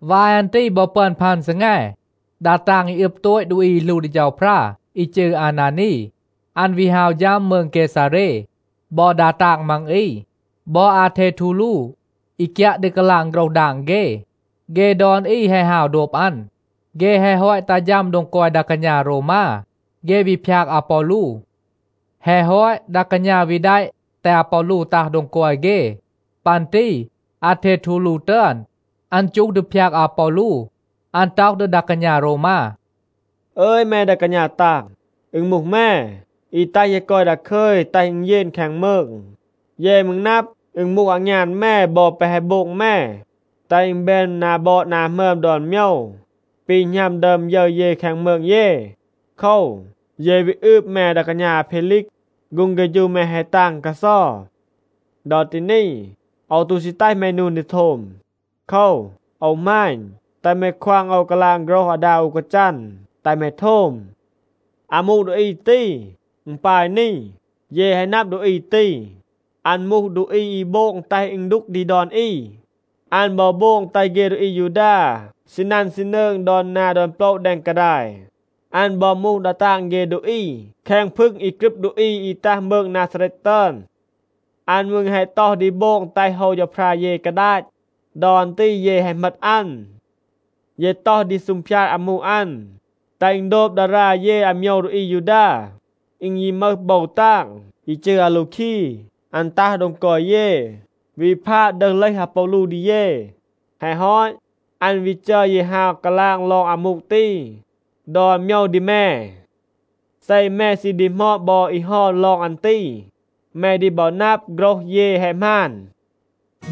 วาย อัน ตี บอ ปึอน พัน ซีแง, ดา ตาง อี อึบ โตต ดูอี อี หลู ดี เฌาพรา, อี จืร อานานี, อัน วี ฮาว ฌัม มืง เกซาเร. บอ ดา ตาง มัง อี, บอ อาเททูลู, อี กยัะ ดี กาลาง โฆรห ดาง เฆ, เฆ ดอน อี แฮะ ฮาว โดบ อัน. เฆ แฮะ ฮอต ตัห ฌัม โดง กอย ดา กาณา โรวมา, เฆ วี พยาก อาปอลู. แฮะ ฮอต, ดา กาณา วี แดะ แตห อาปอลู ตัห โดง กอย เฆ. ปัน ตี อาเททูลู ตึอน, อัน จูห ดี พยาก อาปอลู. อัน ต็อห ดี ดา กาณา โรวมา, “อึย แม ดา กาณา ตาง, อึณ มูห แม, อี แตห เย กอย ดาคึย, แตห อึณ เยน แคง มืง. เย มืร นับ, อึณ มูห อางยาน แม บอ แปะ แฮะ โบง แม, แตห อึณ แบน นา บอด นา หมึอม ดอน โมยว, ปี หณัม ดึอม ยึร เย แคง มืง เย. โคว, เย วี อืบ แม ดา กาณา อาเพลีก. ฆูง เฆฌู แม แฮะ ตาง กาเซา. ดอ ตี นี, โอว ตู ซี แตห แม นูน ดี โทม. โคว, โอว หมาณ, แตห แม ควาง โอว กาลาง โฆรห อาดา อู กาจัน, แตห แม โทม. อามู ดูอี ตี, อึณ ปาย นี. เย แฮะ นับ ดูอี ตี, อัน มูห ดูอี อี โบง แตห อึณ ดูก ดี ดอน อี. อัน บอ โบง แตห เฆ ดูอี อายูดา ซีนัน ซีนืง ดอน นา ดอน โปละ แดง กาดาย. อัน บอ มูห ดา ตาง เฆ ดูอี แคง พึง อี กรึบ ดูอี อี ตัห มืง นาซาเรต ตึอน. อัน มืร แฮะ ต็อห ดี โบง แตห โฮว เฌาพรา เย กาดาต. ดอ อัน ตี เย แฮะ เหมต อัน. เย ต็อห ดี ซูงพยาด อามู อัน, แตห อึณ โดบ ดารา เย อาโมยว ดูอี อายูดา. อึณ ยี มึห โบว ตาง, อี จืร อาลูคี, อัน ตัห โดง กอย เย, วี พาด ดึห เลห อาปอลู ดี เย. แฮะ ฮอต, อัน วี จัร เย ฮาว กาลาง ลอง อามู ตี ดอน โมยว ดี แม. เซ แม ซี ดีหมอด บอ อี เฮา ลอง อัน ตี, แม ดี บอ นับ, โฆรห เย แฮะ หมาน.”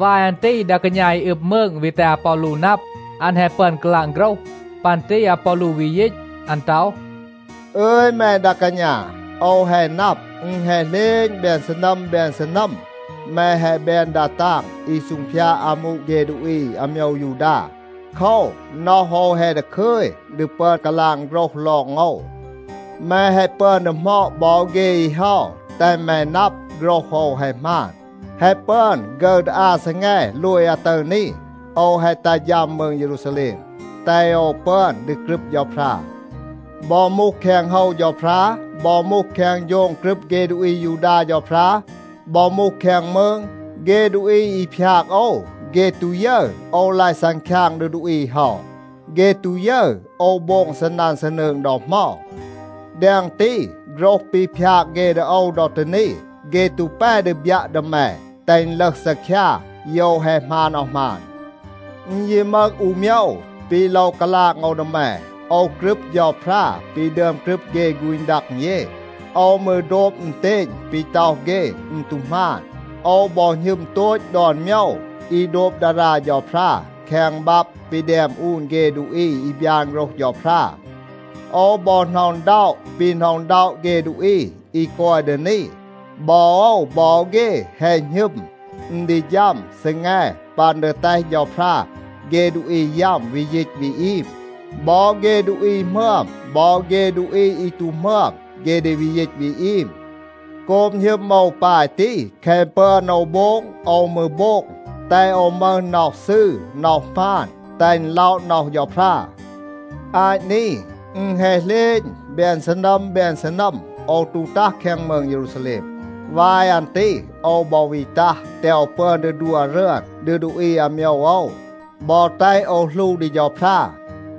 วาย อัน ตี ดา กาณา อี อึบ มืง วี แตห อาปอลู นับ, อัน แฮะ ปึอน กาลาง โฆรห. ปัน ตี อาปอลู วี ยีต. อัน ต็อห, “อึย แม ดา กาณา, โอว แฮะ นับ, อึณ แฮะ เหลณ แบน ซีนัม แบน ซีนัม, แม แฮะ แบน ดา ตาง อี ซูงพยาด อามู เฆ ดูอี อาโมยว ยูดา. โคว, น็อห โอว แฮะ ดาคึย ดี ปึอน กาลาง โฆรห ลอง โอว. แม แฮะ ปึอน ดีหมอด บอ เฆ อี เฮา, แตห แม นับ, โฆรห โอว แฮะ หมาน. แฮะ ปึอน ฆึร ดี อา ซีแง โลย อาตึร นี, โอว แฮะ ตัห ฌัม มืง เยรูซาแลม, แตห โอว ปึอน ดี กรึบ เฌาพรา. บอ มูห แคง โฮว เฌาพรา, บอ มูห แคง โฌง กรึบ เฆ ดูอี อายูดา เฌาพรา, บอ มูห แคง มืง, เฆ ดูอี อี พยาก โอว, เฆ ตู ยึร โอว ลาย ซังคยาง ดี ดูอี เฮา. เฆ ตู ยึร โอว โบง ซีนัน ซีนืง ดอ เหมา. แดง ตี, โฆรห ปี พยาก เฆ ดี โอว ดอ ตี นี, เฆ ตู แป ดี บยัะ ดี แม, แตห อึณ ลึห ซีคยา โยว แฮะ หมาน อาว หมาน. อึณ ยี มึห อู โมยว, ปี โลว กาลาง โอว ดี แม. โอว กรึบ เฌาพรา ปี ดึอม กรึบ เฆ ฆูณ ดัง เย. โอว มืร โดบ อึณเตณ ปี ต็อห เฆ, อึณ ตู หมาน. โอว บอ หณึม โตต ดอน โมยว อี โดบ ดารา เฌาพรา แคง บับ ปี แดม อูน เฆ ดูอี อี บยาน โฆรห เฌาพรา. โอว บอ หน็อะ อึณด็อะ ปี หน็อะ อึณด็อะ เฆ ดูอี อี กอย ดี นี. บอ โอว บอ เฆ แฮะ หณึม, อึณ ดี ฌัม ซีแง ปัน ดี แตห เฌาพรา เฆ ดูอี ยัม วี ยีต วี อีม. บอ เฆ ดูอี หมึอม, บอ เฆ ดูอี อี ตู หมึอม, เฆ ดี วี ยีต วี อีม. โกบ หณึม โอว ปาย ตี, แคะ ปึอน โอว โบง, โอว มืร โบง, แตห โอว มึห น็อห ซืร น็อห หมาน, แตห อึณ ล็อะ น็อห เฌาพรา. อาต นี, อึณ แฮะ เหลณ แบน ซีนัม แบน ซีนัม, โอว ตู ตัห แคง มืง เยรูซาแลม. วาย อัน ตี โอว บอ วี ตัห, แตห โอว ปึอน ดี ดัว รึอน ดี ดูอี อาโมยว โอว, บอ แตห โอว หลู ดี เฌาพรา.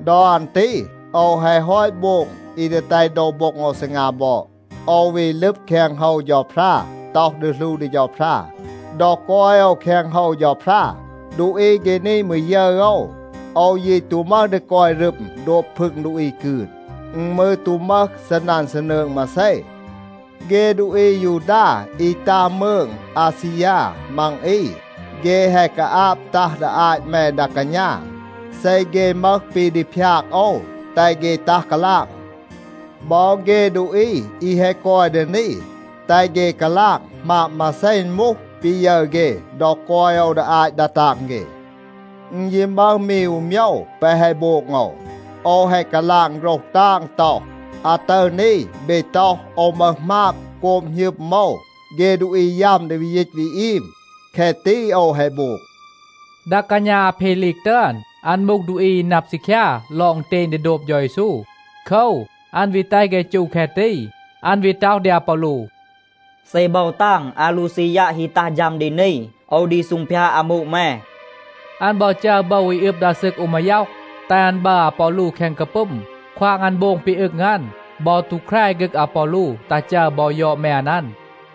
ดอ อัน ตี โอว แฮะ ฮอต โบง อี ดี แตห โดว โบ็ง โอว ซีงา บอด. โอว วี ลึบ แคง โฮว เฌาพรา, ต็อห ดี หลู ดี เฌาพรา. ดอ กอย โอว แคง โฮว เฌาพรา, ดูอี เฆ นี มืร ยึร โอว. โอว ยี ตู มึห ดี กอย รึม โดบ พึง ดูอี กืน. อึณ มืร ตู มึห ซีนัน ซีนืง มาเซ. เฆ ดูอี อายูดา อี ตัห มืง อาซียา มัง อี, เฆ แฮะ กาอาบ ตัห ดี อาต แม ดา กาณา. เซ เฆ มึห ปี ดี พยาก โอว, แตห เฆ ตัห กาลาง. บอ เฆ ดูอี, อี แฮะ กอย ดี นี, แตห เฆ กาลาง, หมาบ มาเซ อึณ มูห ปี ยึร เฆ ดอ กอย โอว ดี อาต ดา ตาง เฆ. อึณ ยี มึห มี อู โมยว, แปะ แฮะ โบง โอว. โอว แฮะ กาลาง โฆรห ตาง ต็อห, ‘อาตึร นี เบ ต็อห, โอว มึห หมาบ โกบ หณึม โอว เฆ ดูอี ยัม ดี วี ยีต วี อีม.’ แคะ ตี โอว แฮะ โบง.” ดา กาณา อาเพลีก ตึอน, อัน มูห ดูอี อี นับ ซีคยา ลอง อึณเตณ ดี โดบ เฌา เยซู. โคว, อัน วี แตห เฆ จู แคะ ตี. อัน วี ต็อห ดี อาปอลู, “เซ โบว ตาง อาลูซียัะ ฮี ตัห ฌัม ดี นี, โอว ดี ซูงพยาด อามู แม.” อัน บอ จัร โบว อี อึบ ดา ซึก อู มาย็อห, แตห อัน บัร อาปอลู แคง กาปึม, ควาง อัน โบง ปี อึง อัน, บอ ตู แคร ฆึก อาปอลู ตัห จัร บอ ยอด แมน อัน.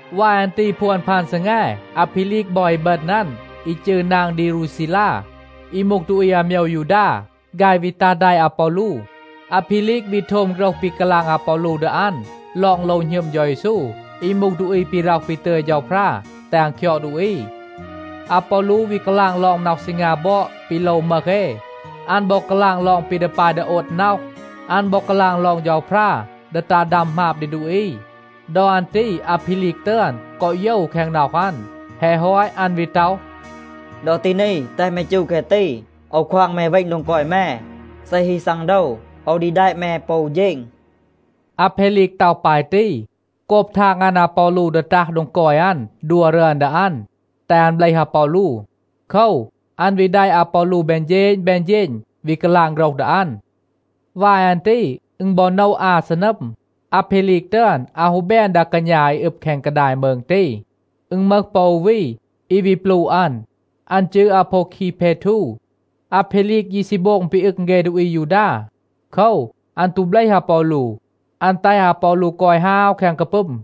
วาย อัน ตี พวน พัน ซีแง, อาเพลีก บอ อีบึณ อัน, อี จืร นาง ดีรูซีลา, อี มูห ดูอี อาโมยว ยูดา, ฆาย วี ตัห แดะ อาปอลู. อาเพลีก วี โทม โฆรห ปี กาลาง อาปอลู ดี อัน ลอง โลว หณึม เฌา เยซู, อี มูห ดูอี ปี ร็อห ปี ตึย เฌาพรา แตห อัน คยอด ดูอี. อาปอลู วี กาลาง ลอง น็อห ซีงา บอด ปี โลว มึห เอ. อัน บอ กาลาง ลอง ปี ดี ปาย ดี โอด น็อห. อัน บอ กาลาง ลอง เฌาพรา ดี ตัห ดัม หมาบ ดี ดูอี. ดอ อัน ตี อาเพลีก ตึอน กอ โยว แคง น็อห อัน. แฮะ ฮอต, อัน วี ต็อห, “ดอ ตี นี, แตห แม จู แคะ ตี. โอว ควาง แม เวณ โดง กอย แม. เซ ฮี ซังโดว, โอว ดี แดะ แม ปอ อู เฌณ.” อาเพลีก ต็อห ปาย ตี, โกบ ทาง อัน อาปอลู ดี ตัห โดง กอย อัน ดัว รึอน ดี อัน, แตห อัน เบลห อาปอลู. โคว, อัน วี แดะ อาปอลู แบน เฌณ, แบน เฌณ, วี กาลาง โฆรห ดี อัน. วาย อัน ตี อึณ บอ โนะ อา ซีนัม, อาเพลีก ตึอน อาว ฮู แบน ดา กาณา อี อึบ แคง กาดาย มืง ตี. อึณ มึห ปอ อู วี, อี วี ปลูะ อัน. อัน จืร อาโพวคี เพทู. อาเพลีก ยี ซี โบง ปี อึง เฆ ดูอี อายูดา. โคว, อัน ตู เบลห อาปอลู. อัน แตห อาปอลู กอย ฮาว แคง กาปึม.